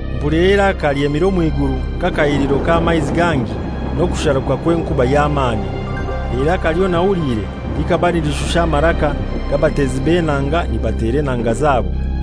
Mpulira eiraka lyemire omw'iguru nk'akahiliro k'amaizi gangi n'okusharuka kw'enkuba y'amani. Eiraka lyonahuliire likaba nilishusha amaraka g'abatezi b'enanga nibatera enanga zabo,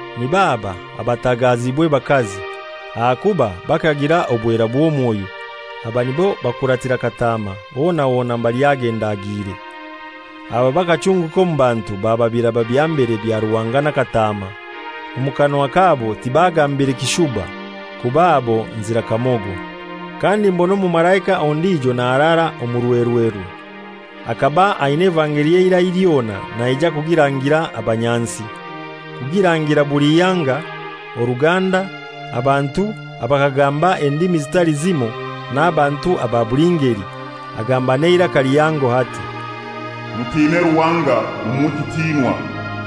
Nib'aba abatahagaziibwe bakazi, ahakuba bakagira obwera bw'omwoyo. Abo nibo bakuratira Kataama hona hona mbali agenda agiire. Aba bakachunguka omu bantu baba biraba bya mbere bya Ruhanga na Kataama. Omu kanwa kabo tibagambire kishuba, kuba abo nzira kamogo. Kandi mbona omumalaika ondijo naharara omurwerwerwe. Akaba ainai evangeli ey'eirai lyona naija kugirangira abanyansi, kugirangira buli ihanga, oruganda, abantu abakagamba endimi zitali zimoi n'abantu aba buli ngeli. Agamba n'eiraka lihango ati, «Mutine Ruhanga, mumuhe ekitinwa,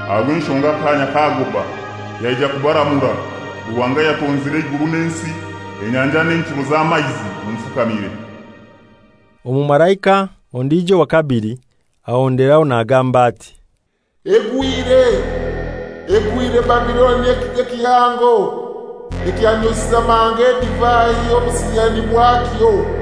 aha rw'enshonga akaanya kagoba yaija kubaramura. Ruhanga ayatonzire eiguru n'ensi, enyanja n'enchuro z'amaizi mumufukamire.» Omumalaika ondijo owa kabili, ahonderaho nagamba ati, «Egwire, egwire Babiloni ekigo kihango ekyanyoisize amahanga edivai y'obusiyani bwakyo.»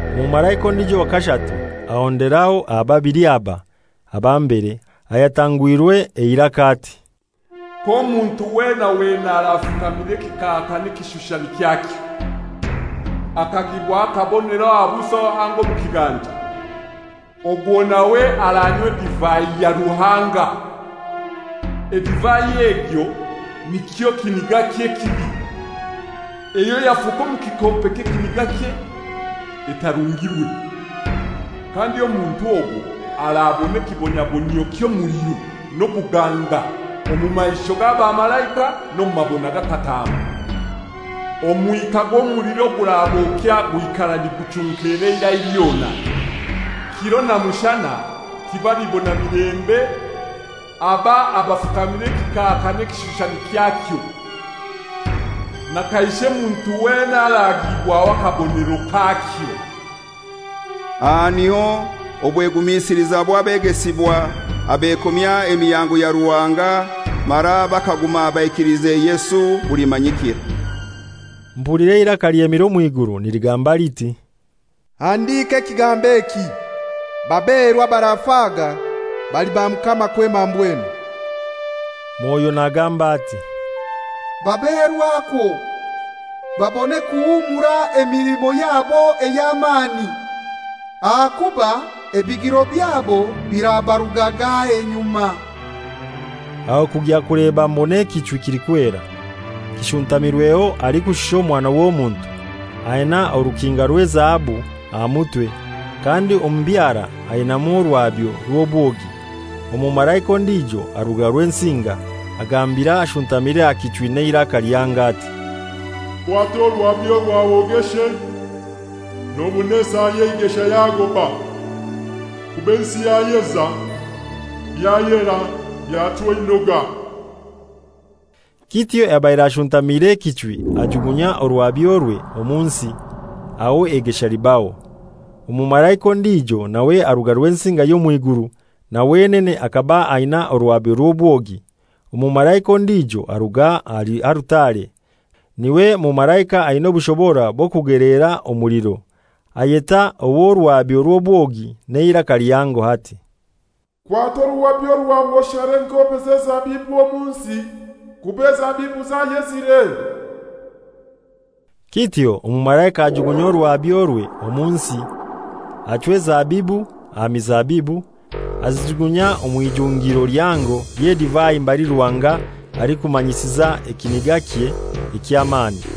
Omumalaika ondijo owa kashatu, ahonderaho aha babili aba, aba mbere, ayatangwire eiraka ati, «K'omuntu wena wena arafukamira ekikaaka n'ekishushani kyakyo, akagiibwaho akabonero aha buso anga omu kiganja, ogwo nawe aranywa edivai ya Ruhanga, edivai egyo nikyo kinigakye ekibi, eyo yafuka omu kikompe ky'ekinigakye etarungirwe, kandi omuntu ogwo arabona ekibonabonyio ky'omuliro n'obuganga omu maisho g'abamalaika n'omu mabona ga Kataama. Omwika gw'omuliro ogurabokya gwikara niguchunkera eirai lyona. Kiro na mushana tibalibona milembe aba abafukamira ekikaaka n'ekishushani kyakyo, na kaishe muntu wena aragiibwaho akabonero kakyo.» Aha niho obwegumisiliza bw'abegesibwa abekomya emihango ya Ruhanga mara bakaguma baikiliize Yesu bulimanyikira. Mpulira eiraka lyemire omw'iguru niligamba liti, «Handika ekigambo eki: Baberwa abarafaga bali ba Mukama kwema mbwenu.» Mwoyo nagamba ati, «Baberwa kwo, babone kuhumura emilimo yabo ey'amani, aha kuba ebigiro byabo birabarugaga enyuma!» Aho kugya kuleba mbona ekichwi kilikwera, kishuntamirweho alikushusha Omwana w'Omuntu, aina orukinga rw'ezahabu aha mutwe, kandi omu byara ainaimu oruhabyo rw'obwogi. Omumalaika ondijo aruga Rwensinga, agambira ashuntamire aha kichwi n'eiraka lihango ati, «Kwata oruhabyo rwawe ogeshe, nobona esaa y'eigesha yagoba, kuba ensi yayeza, byayera byachwa einoga.» Kityo ayabaire ashuntamire ekichwi ajugunya oruhabyorwe omu nsi, aho eigesha libaho. Omumalaika ondijo nawe aruga Rwensinga y'omw'iguru, na wenene akaba ainai oruhabyo rw'obwogi. Omumalaika ondijo aruga ahali alutare, n'iwe mumalaika aina obushobora bw'okugelera omuliro, ayeta ow'oruhabyo rw'obwogi n'eiraka lihango ati, «Kwata oruhabyo rwawe oshare engoobe z'ezabibu omu nsi, kuba ezabibu zayezire.» Kityo omumalaika ajugunya oruhabyorwe omu nsi, achwa ezabibu aha mizabibu, azijugunya omw'ijungiro lihango ly'edivai mbali Ruhanga alikumanyisiza ekinigakye eky'amani.